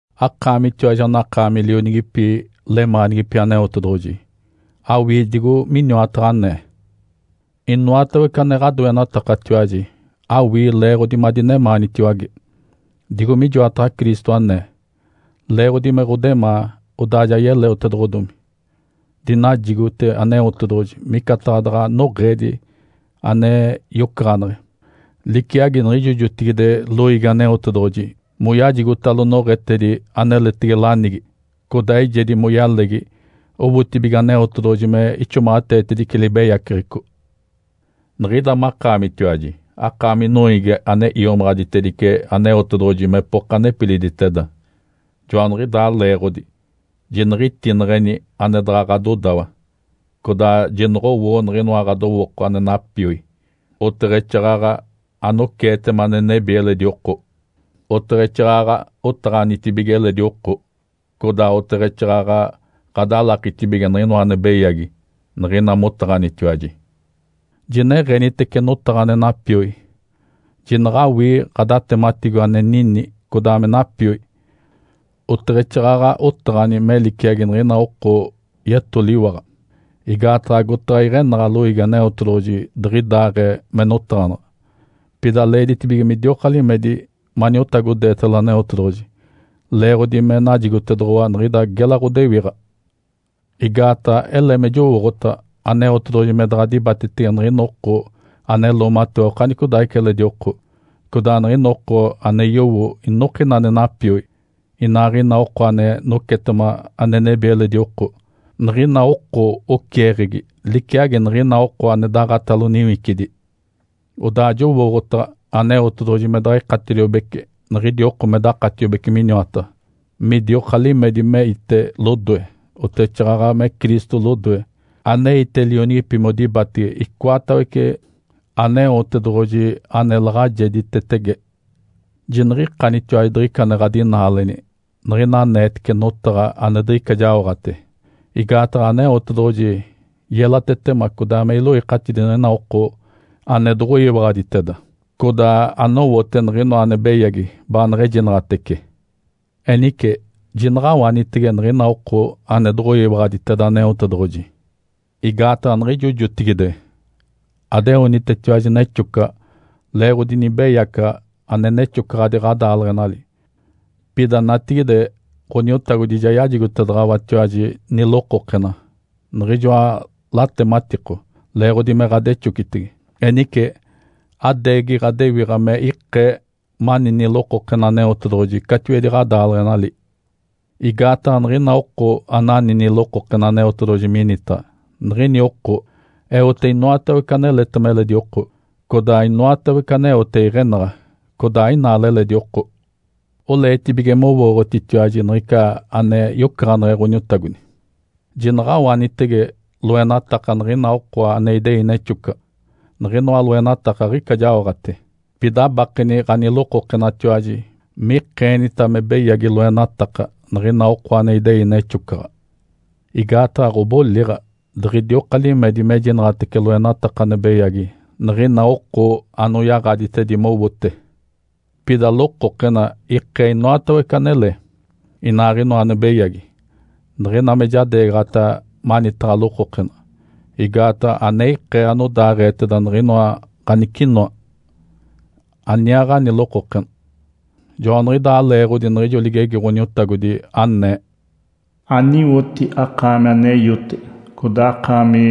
Akaamitiwaji anakaami lionigipi, lemaanigipi Aneotedoɡ̶oji. Awii digo miniwataɡ̶a anee. Inoatawece ane ɡ̶adoenatakatiwaji, awii leeɡ̶odi madinemaanitiwage, digo mijoataɡ̶a Cristo anee. Leeɡ̶odi me ɡ̶odemaa, odaa ja yeleotedoɡ̶odomi. Dinajigote Aneotedoɡ̶oji micataɡ̶a daɡ̶a noɡ̶eedi ane yocaɡ̶aneɡ̶e, liciagi niɡ̶ijo jotigide loiigi Aneotedoɡ̶oji moyajigotalo noɡ̶etedi aneletege lanigi, codaa eijedi moyalegi owotibige Aneotedoɡ̶oji me ixomaɡ̶ateetedice libeyaceɡ̶eco. Niɡ̶ida makaamitiwaji, akaami noiigi ane iomaɡ̶aditedice Aneotedoɡ̶oji mepoka nepiliditeda. Joaniɡ̶idaa leeɡ̶odi, jiniɡ̶itineɡ̶eni ane daɡ̶a ɡ̶adodawa, codaa jinoɡ̶owoo niɡ̶inoa ɡ̶adowooko ane napioi, oteɡ̶exaaɡ̶aɡ̶a anoceetema ane nebi eledi oko. Oteɡ̶exaaɡ̶aɡ̶a otaɡ̶anitibige eledi oko, codaa oteɡ̶exaaɡ̶aɡ̶a ɡ̶adalakitibige niɡ̶inoa ane beyagi niɡ̶ina motaɡ̶anitiwaji. Jineɡ̶enitece notaɡ̶a ane napioi, jinaɡ̶awii ɡ̶adatematiko ane nini codaa me napioi, oteɡ̶exaaɡ̶aɡ̶a otaɡ̶ani me liciagi niɡ̶ina oko yetoliwaɡ̶a, igaataɡ̶a agotaɡ̶a iɡ̶enaɡ̶a loiigi Aneotedoɡ̶oji diɡ̶idaaɡ̶ee me notaɡ̶anaɡ̶a. Pida leeditibige midioka limedi maniotagodeetalo Aneotedoɡ̶oji, leeɡ̶odi me najigotedoɡ̶owa niɡ̶ida gela ɡ̶odewiɡ̶a. Igaataɡ̶a ele me jowooɡ̶otaɡ̶a Aneotedoɡ̶oji me daɡ̶a dibatetege niɡ̶ina oko ane loomatewa okanicodaaɡ̶ica eledi oko, codaa niɡ̶ina oko ane yowo inokina ane napioi, inaaɡ̶ina oko ane nocetema ane nebi eledi oko. Niɡ̶ina oko oceeɡ̶egi liciagi niɡ̶ina oko ane daɡ̶atalo niwicidi. Odaa jowooɡ̶otaɡ̶a Aneotedoɡ̶oji me daɡ̶a ikatediobece niɡ̶idi oko me dakatiobece miniwataɡ̶a, midioka limedi meite lodoe, oteɡ̶exaaɡ̶aɡ̶a me Cristo lodoe, aneite lionigipi modibatege icoatawece Aneotedoɡ̶oji ane laɡ̶ajeditetege. Jiniɡ̶ikanitiwaji diɡ̶ica ane ɡ̶adinaaleni, niɡ̶ina aneetece notaɡ̶a ane diɡ̶ica ane jaoɡ̶ate. Igaataɡ̶a Aneotedoɡ̶oji yelatetema codaa me iloikatidi niɡ̶ina oko ane doɡ̶oyiwaɡ̶aditeda, codaa anowote niɡ̶inoa ane beyagi baaneɡ̶ejinaɡ̶atece. Enice, jinaɡ̶awanitege niɡ̶ina oko ane doɡ̶oyiwaɡ̶aditeda Aneotedoɡ̶oji. Igaataɡ̶a niɡ̶ijo jotigide adeonitetiwaji nexocaɡ̶a leeɡ̶odi nibeyacaɡ̶a ane nexocaɡ̶adi ɡ̶adaaleɡ̶enali. Pida natigide Ǥoniotagodi ja yajigotedaɡ̶awatiwaji nilokokena, niɡ̶ijoa latematiko, leeɡ̶odi me ɡ̶adexocitege. Enice adeegi ɡ̶adewiɡ̶a me ikee mani nilokokena Aneotedoɡ̶oji catiwedi ɡ̶adaaleɡ̶enali. Igaataɡ̶a niɡ̶ina oko anani nilokokena Aneotedoɡ̶oji minitaɡ̶a, niɡ̶ini oko eote inoatawece aneletema eledi oko, codaa inoatawece aneote iɡ̶enaɡ̶a, codaa ainaale eledi oko. Oleetibige mowooɡ̶otitiwaji niɡ̶ica ane yocaɡ̶aneɡ̶e Ǥoniotagodi. Jinaɡ̶awanitege loenataka niɡ̶ina oko ane idei nexocaɡ̶a. Niɡ̶inoa loenataka aɡ̶ica jaoɡ̶ate. Pida abakeni ɡ̶anilokokenatiwaji mikeenita me beyagi loenataka niɡ̶ina oko ane idei nexocaɡ̶a. Igaataɡ̶a ɡ̶odiboliɡ̶a, diɡ̶idioka limedi mejinaɡ̶atece loenataka ane beyagi niɡ̶ina oko anoyaɡ̶aditedi mowote. Pida lokokena ikee inoatawece anele, inaaɡ̶inoa ane beyagi, niɡ̶ina me jadeegaɡ̶ata manitaɡ̶a lokokena. Igaataɡ̶a ane ikee anodaaɡ̶eeteda niɡ̶inoa ganicinoa, aniaaɡ̶ani lokokena. Joaniɡ̶idaa leeɡ̶odi niɡ̶ijo ligegi Ǥoniotagodi, anee, “Aniwoti, akaami ane iote! Codaa akaami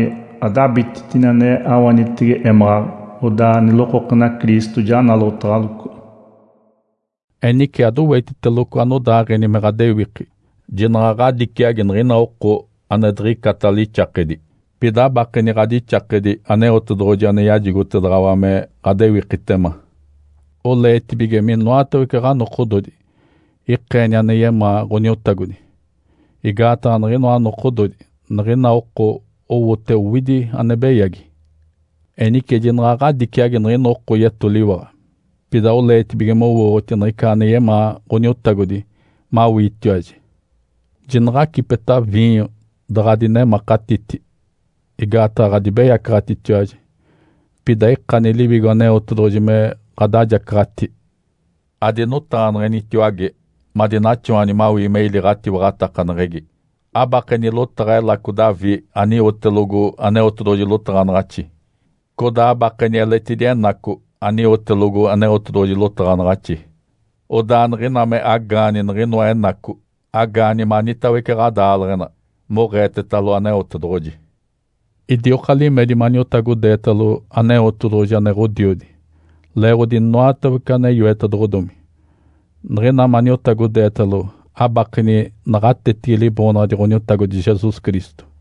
adabititini ane awanitege émaɡ̶aɡ̶a! Odaa nilokokena Cristo ja nalotaɡ̶aloco.” Enice adowetiteloco anodaaɡ̶eni me ɡ̶adewiki. Jinaɡ̶a ɡ̶adiciagi niɡ̶ina oko ane diɡ̶icata lixakedi, pida abakeni ɡ̶adixakedi Aneotedoɡ̶oji ane yajigotedaɡ̶awa me ɡ̶adewikitema. Oleetibige minoatawece ɡ̶anokododi ikeeni ane yemaa Ǥoniotagodi, igaataɡ̶a niɡ̶inoa nokododi niɡ̶ina oko owote owidi ane beyagi. Enice jinaɡ̶a ɡ̶adiciagi niɡ̶ina oko yetoliwaɡ̶a, pida oleetibige mowooɡ̶oti niɡ̶ica ane yemaa Ǥoniotagodi mawiitiwaji. Jinaɡ̶acipeta viinyo daɡ̶a adinemakatiti, igaataɡ̶a ɡ̶adibeyacaɡ̶atitiwaji. Pida ikani Liwigo Aneotedoɡ̶oji me ɡ̶adajacaɡ̶ati. Adinotaɡ̶aneɡ̶enitiwage madinaxawani mawii me ili ɡ̶atiwaɡ̶atakaneɡ̶egi, abakeni lotaɡ̶a Elaco Davi aniwotelogo Aneotedoɡ̶oji lotaɡ̶anaɡ̶axi, codaa abakeni eletidi Enaco, aniwotelogo Aneotedoɡ̶oji lotaɡ̶anaɡ̶axi. Odaa niɡ̶ina me agaani niɡ̶inoa Enaco, agaani manitawece ɡ̶adaaleɡ̶ena moɡ̶eetetalo Aneotedoɡ̶oji. Idioka limedi maniotagodeetalo Aneotedoɡ̶oji ane Ǥodiodi leeɡ̶odi inoatawece ane yoetedoɡ̶odomi. Niɡ̶ina maniotagodeetalo, abakeni naɡ̶atetigi Liboonaɡ̶adi Ǥoniotagodi Jesus Cristo.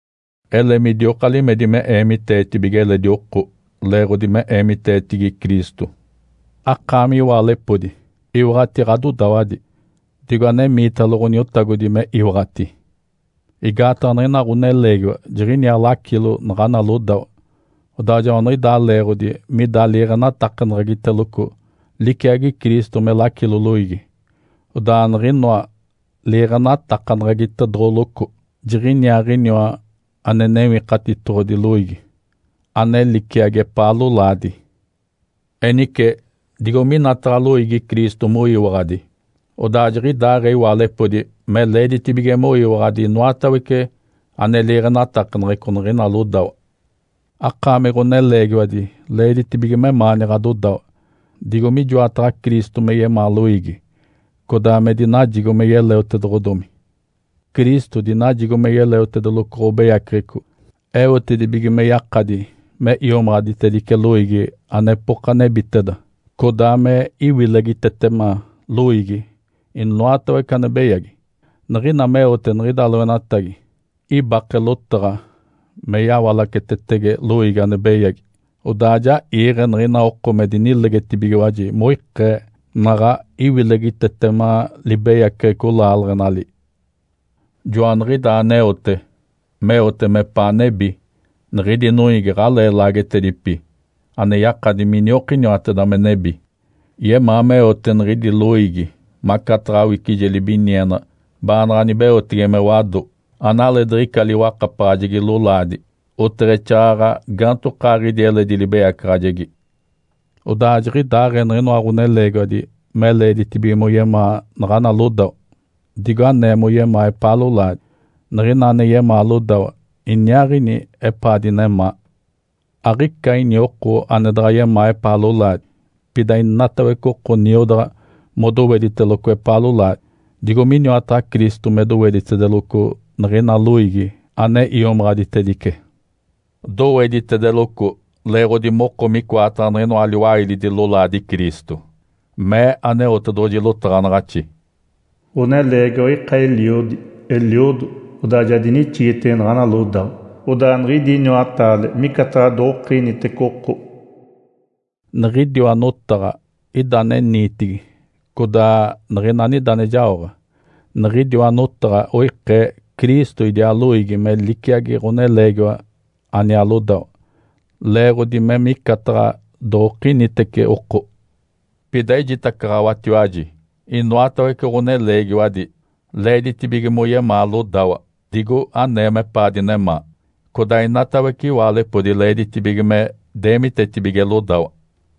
Ele midioka limedi me eemiteetibige eledi oko leeɡ̶odi me eemiteetigi Cristo. Akaami iwaalepodi, iwaɡ̶ati ɡ̶adodawadi, digo anemiitalo Ǥoniotagodi me iwaɡ̶ati. Igaataɡ̶a niɡ̶ina ɡ̶oneleegiwa jiɡ̶iniaa lacilo naɡ̶ana lodawa, odaa joaniɡ̶idaa leeɡ̶odi mida liiɡ̶enatakaneɡ̶egiteloco, liciagi Cristo me lacilo loiigi, odaa niɡ̶inoa liiɡ̶enatakaneɡ̶egitedoɡ̶oloco. Jiɡ̶iniaaɡ̶iniwa ane Newikatitoɡ̶odi loiigi, ane liciagi epaa lolaadi. Enice, digo minataɡ̶a loiigi Cristo moyiwaɡ̶adi, odaa jiɡ̶idaaɡ̶ee iwaalepodi me leeditibige moyiwaɡ̶adi inoatawece ane liiɡ̶enatakaneɡ̶eco niɡ̶ina lodawa. Akaami ɡ̶oneleegiwadi leeditibige memaani ɡ̶adodawa, digo mijoataɡ̶a Cristo me yemaa loiigi, codaa me dinajigo me yeleotedoɡ̶odomi. Cristo dinajigo me yeleotedeloco ɡ̶obeyaceɡ̶eco eotedibige me yakadi me iomaɡ̶aditedice loiigi anepoka nebiteda, codaa me iwilegitetema loiigi inoatawece ane beyagi. Niɡ̶ina meote niɡ̶ida loenatagi, ibake lotaɡ̶a me yawalacetetege loiigi ane beyagi, odaa ja iiɡ̶e niɡ̶ina oko me dinilegetibigiwaji moikee naɡ̶a iwilegitetema libeyaceɡ̶eco laaleɡ̶enali. Joaniɡ̶idaa aneote, meote mepaa nebi, niɡ̶idi noiigi aɡ̶alee laagetedipi, ane yakadi miniokiniwateda me nebi. Yemaa meote niɡ̶idi loiigi macataɡ̶a awicije libiniena baanaɡ̶a nibeotege me wado, analeediɡ̶ica liwakapaɡ̶ajegi lolaadi, oteɡ̶exaaɡ̶aɡ̶a gaantokaaɡ̶idi eledi libeyacaɡ̶ajegi. Odaa jiɡ̶idaaɡ̶ee niɡ̶inoa ɡ̶oneleegiwadi me leeditibige moyemaa naɡ̶ana lodawa digo anee moyemaa epaa lolaadi. Niɡ̶ina ane yemaa lodawa iniaaɡ̶ini epaa dinemaa. Aɡ̶ica ini oko ane daɡ̶a yemaa epaa lolaadi. Pida inatawece oko niodaɡ̶a modowediteloco epaa lolaadi, digo miniwataɡ̶a Cristo me doweditedeloco niɡ̶ina loiigi ane iomaɡ̶aditedice. Doweditedeloco leeɡ̶odi moko micoataɡ̶a niɡ̶inoa liwailidi lolaadi Cristo. Mee Aneotedoɡ̶oji lotaɡ̶anaɡ̶axi, “Ǥoneleegiwa ika eliodi, eliodo, odaa ja dinixigitege naɡ̶ana lodawa. Odaa niɡ̶idi iniwataale micataɡ̶a doɡ̶okinitece oko.” Niɡ̶idiwa notaɡ̶a ida ane niitigi codaa niɡ̶ina anida ane jaoɡ̶a. Niɡ̶idiwa notaɡ̶a oikee Cristo idiaa loiigi me liciagi ɡ̶oneleegiwa aniaa lodawa, leeɡ̶odi me micataɡ̶a doɡ̶okinitece oko. Pida ejitacaɡ̶awatiwaji. Inoatawece ɡ̶oneleegiwadi leeditibige moyemaa lodawa digo anee mepaa dinemaa. Codaa inatawece iwaalepodi leeditibige me deemitetibige lodawa.